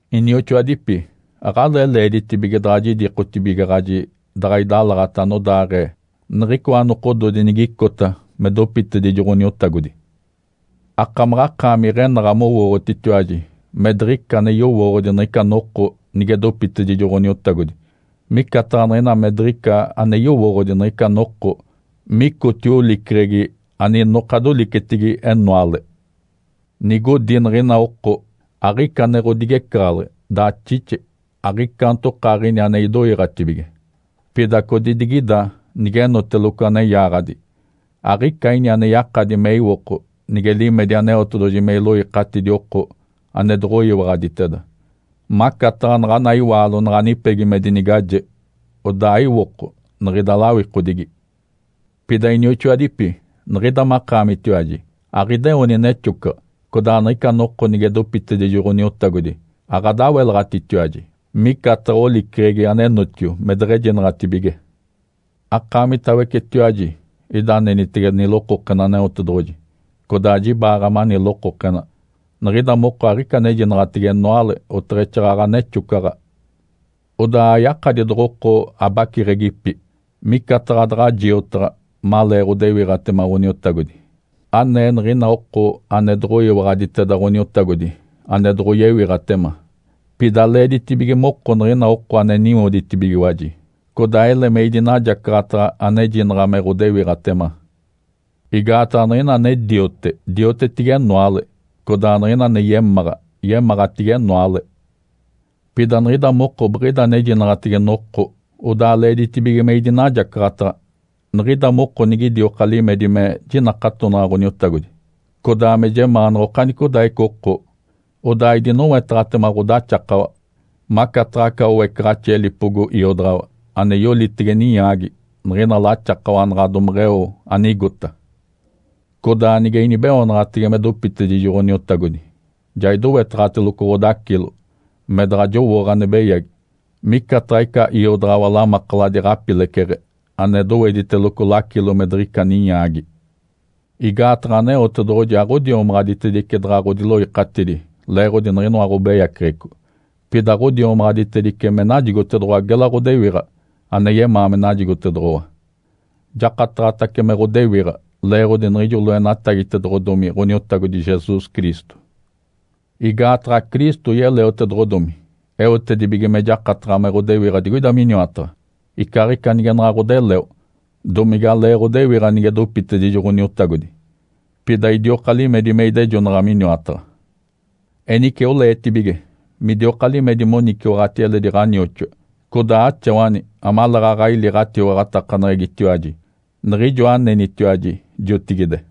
Inioxoadipi. Aɡ̶alee leeditibige daɡ̶a jidikotibigaɡ̶aji daɡ̶a idalaɡ̶ata anodaaɡ̶ee niɡ̶icoa nokododi nigicota me dopitedijo Ǥoniotagodi. Akamaɡ̶akaami iɡ̶enaɡ̶a mowooɡ̶otitiwaji me diɡ̶ica ane yowooɡ̶odi niɡ̶ica noko nige dopitedijo Ǥoniotagodi, micataɡ̶a niɡ̶ina me diɡ̶ica ane yowooɡ̶odi niɡ̶ica noko micotio oliceɡ̶egi aninoka dolicetigi enoale. Nigodi niɡ̶ina oko, “Aɡ̶ica ane ɡ̶odigecaɡ̶aleɡ̶e, daxixe, aɡ̶icaantokaaɡ̶ini ane idoiiɡ̶atibige.” Pida codidigida, nigenoteloco ane yaaɡ̶adi. Aɡ̶ica ini ane yakadi me iwoko nige limedi Aneotedoɡ̶oji me iloikatidi oko ane doɡ̶oyiwaɡ̶aditeda, macataɡ̶a naɡ̶ana iwaalo naɡ̶a nipegi me dinigaje odaa aiwoko niɡ̶ida lawikodigi. Pida, inioxoadipi, niɡ̶ida makaamitiwaji aɡ̶ideoni nexocaɡ̶a, codaa niɡ̶ica noko nige dopitedijo Ǥoniotagodi aɡ̶adawelaɡ̶atitiwaji, micataɡ̶a oliceɡ̶egi anenotio me deɡ̶ejinaɡ̶atibige. Akaamitawecetiwaji ida anenitege nilokokena Aneotedoɡ̶oji, codaa jibaaɡ̶a mani lokokena. Niɡ̶ida moko aɡ̶ica anejinaɡ̶atege enoale, oteɡ̶exaaɡ̶aɡ̶a nexocaɡ̶a. Odaa ayakadi doɡ̶oko abaciɡ̶egipi micataɡ̶a daɡ̶a jiotaɡ̶a malee ɡ̶odewiɡ̶atema Ǥoniotagodi, anee niɡ̶ina oko ane doɡ̶oyiwaɡ̶aditeda Ǥoniotagodi ane doɡ̶oyewiɡ̶atema. Pida leeditibige moko niɡ̶ina oko ane niwoditibigiwaji, codaa ele me idinajacaɡ̶ataɡ̶a anejinaɡ̶a me ɡ̶odewiɡ̶atema. Igaataɡ̶a niɡ̶ina ane diote, diotetigi enoale, codaa niɡ̶ina ane yemáɡ̶a, yemáɡ̶atigi enoale. Pida niɡ̶ida moko biɡ̶ida anejinaɡ̶atege noko, odaa leeditibige me idinajacaɡ̶ataɡ̶a. Niɡ̶ida moko nigidioka limedi me jinakatonaɡ̶a Ǥoniotagodi, codaa me jemaanaɡ̶a okanicodaaɡ̶ica oko, odaa idinowetaɡ̶atema ɡ̶odaxakawa, macataɡ̶a aca oecaɡ̶axi elipogo iodaɡ̶awa ane yolitege ninyaagi niɡ̶ina laxakawa naɡ̶a domeɡ̶eo anigota. Codaa nige inibeoonaɡ̶atege me dopitedijo Ǥoniotagodi, ja idowetaɡ̶ateloco ɡ̶odacilo me daɡ̶a jowooɡ̶a ane beyagi, micataɡ̶a ica iodaɡ̶awa lamakaladi ɡ̶apileceɡ̶e ane dowediteloco lacilo me diɡ̶ica ninyaagi. Igaataɡ̶a Aneotedoɡ̶oji aɡ̶odiomaɡ̶aditedice daɡ̶a ɡ̶odiloikatidi leeɡ̶odi niɡ̶inoa ɡ̶obeyaceɡ̶eco, pida ɡ̶odiomaɡ̶aditedice me najigotedoɡ̶owa gela ɡ̶odewiɡ̶a ane yemaa me najigotedoɡ̶owa. Jakataɡ̶atace me ɡ̶odewiɡ̶a leeɡ̶odi niɡ̶ijo loenatagitedoɡ̶odomi Ǥoniotagodi Jesus Cristo. Igaataɡ̶a Cristo yeleotedoɡ̶odomi eotedibige me jakataɡ̶a me ɡ̶odewiɡ̶a digoida miniwataɡ̶a, icaaɡ̶ica nige naɡ̶a ɡ̶odeleo, domigalee ɡ̶odewiɡ̶a nige dopitedijo Ǥoniotagodi, pida idioka limedi me idejonaɡ̶a miniwataɡ̶a. Enice oleetibige midioka limedi moniciwaɡ̶ati eledi ɡ̶anioxoa, codaa axawani amaleeɡ̶aɡ̶a ili ɡ̶atiwaɡ̶atakaneɡ̶egitiwaji, niɡ̶ijo anenitiwaji jotigide.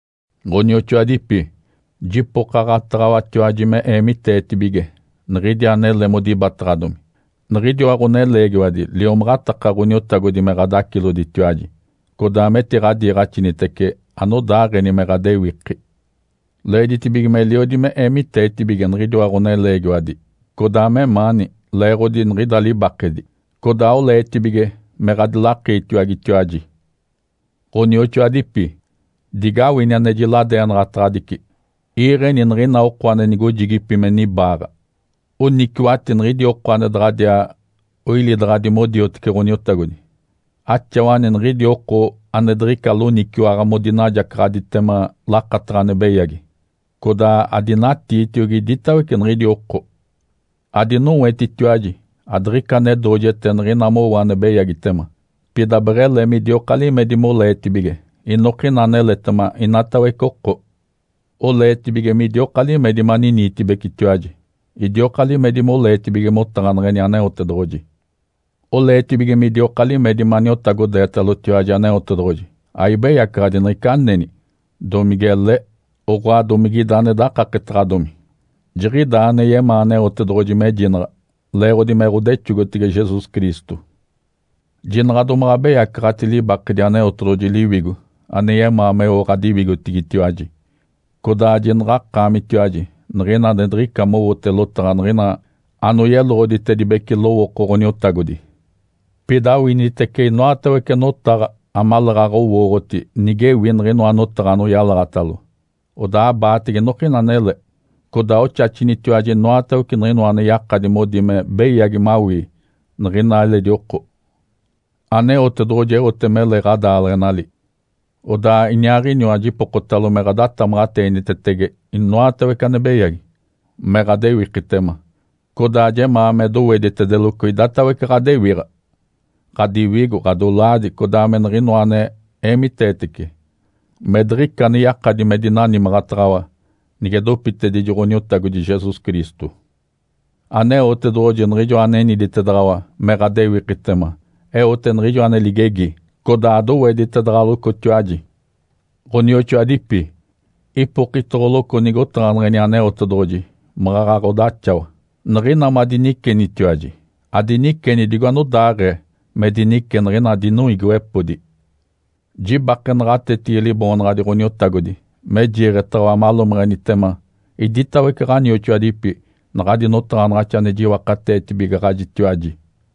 Ǥonioxoadipi. Jipokaɡ̶ataɡ̶awatiwaji me eemiteetibige niɡ̶idi anele modibataɡ̶adomi, niɡ̶idiwa ɡ̶oneleegiwadi liomaɡ̶ataka Ǥoniotagodi me ɡ̶adaciloditiwaji, codaa metiɡ̶adiiɡ̶axinitece anodaaɡ̶eni me ɡ̶adewiki. Leeditibige meliodi me eemiteetibige niɡ̶idiwa ɡ̶oneleegiwadi, codaa memaani, leeɡ̶odi niɡ̶ida libakedi. Codaa oleetibige me ɡ̶adilakiitiwagetiwaji. Ǥonioxoadipi. Digawini ane jiladeenaɡ̶ataɡ̶adici: Iiɡ̶eni niɡ̶ina oko nigojigipi me nibaaɡ̶a, oniciwaɡ̶ati niɡ̶idi oko ane daɡ̶adiaa oilidaɡ̶adi modiotece Ǥoniotagodi, axawani niɡ̶idi oko ane diɡ̶ica loniciwaɡ̶a modinajacaɡ̶aditema lakataɡ̶a ane beyagi, codaa adinatiitiogi iditawece niɡ̶idi oko. Adinowetitiwaji adiɡ̶ica ane doojete niɡ̶ina mowo ane beyagitema. Pida beɡ̶ele midioka limedi moleetibige inokina aneletema inatawece oko. Oleetibige midioka limedi maniniitibecetiwaji. Idioka limedi moleetibige motaɡ̶aneɡ̶eni Aneotedoɡ̶oji. Oleetibige midioka limedi me aniotagodeetalotiwaji Aneotedoɡ̶oji, aibeyacaɡ̶adi niɡ̶ica aneni, domigele, oɡ̶oa, domige ida ane dakaketaɡ̶adomi. Jiɡ̶idaa ane yemaa Aneotedoɡ̶oji mejinaɡ̶a, leeɡ̶odi me ɡ̶odexogotege Jesus Cristo. Jinaɡ̶a domaɡ̶a abeyacaɡ̶ati libakedi Aneotedoɡ̶oji Liwigo ane yemaa meo ɡ̶adiwigotigitiwaji. Codaa jinaɡ̶akaamitiwaji niɡ̶ina ane diɡ̶ica mowote lotaɡ̶a niɡ̶ina anoyeloɡ̶oditedibece lowooko Ǥoniotagodi. Pida awinitece inoatawece notaɡ̶a amaleeɡ̶aɡ̶a owooɡ̶oti nigewi niɡ̶inoa notaɡ̶a anoyalaɡ̶atalo, odaa abaatege inokina anele. Codaa oxaxinitiwaji inoatawece niɡ̶inoa ane yakadi modi me beyagi mawii niɡ̶ina eledi oko. Aneotedoɡ̶oji eote mele ɡ̶odaaleɡ̶enali. Odaa Iniaaɡ̶iniwa jipokotalo me ɡ̶adatamaɡ̶ateenitetege inoatawece ane beyagi, me ɡ̶adewikitema. Codaa jemaa me doweditedeloco idatawece ɡ̶adewiɡ̶a: Ǥadiwigo, ɡ̶adolaadi, codaa me niɡ̶inoa ane eemiteetece, me diɡ̶ica ane yakadi me dinanimaɡ̶ataɡ̶awa nige dopitedijo Ǥoniotagodi Jesus Cristo. Aneotedoɡ̶oji niɡ̶ijoa aneniditedaɡ̶awa me ɡ̶adewikitema eote niɡ̶ijo ane ligegi, codaa doweditedaɡ̶alocotiwaji. Ǥonioxoadipi. Ipokitoɡ̶oloco nigotaɡ̶aneɡ̶eni Aneotedoɡ̶oji maɡ̶aɡ̶a ɡ̶odaxawa. Niɡ̶ina madinicenitiwaji, adiniceni digo anodaaɡ̶ee me dinice niɡ̶ina dinoiigiwepodi. Jibake naɡ̶atetigi Liboonaɡ̶adi Ǥoniotagodi me jiiɡ̶etaɡ̶awa malomeɡ̶enitema iditawece ɡ̶onioxoadipi naɡ̶adi notaɡ̶anaɡ̶axi ane jiwakateetibigaɡ̶ajitiwaji.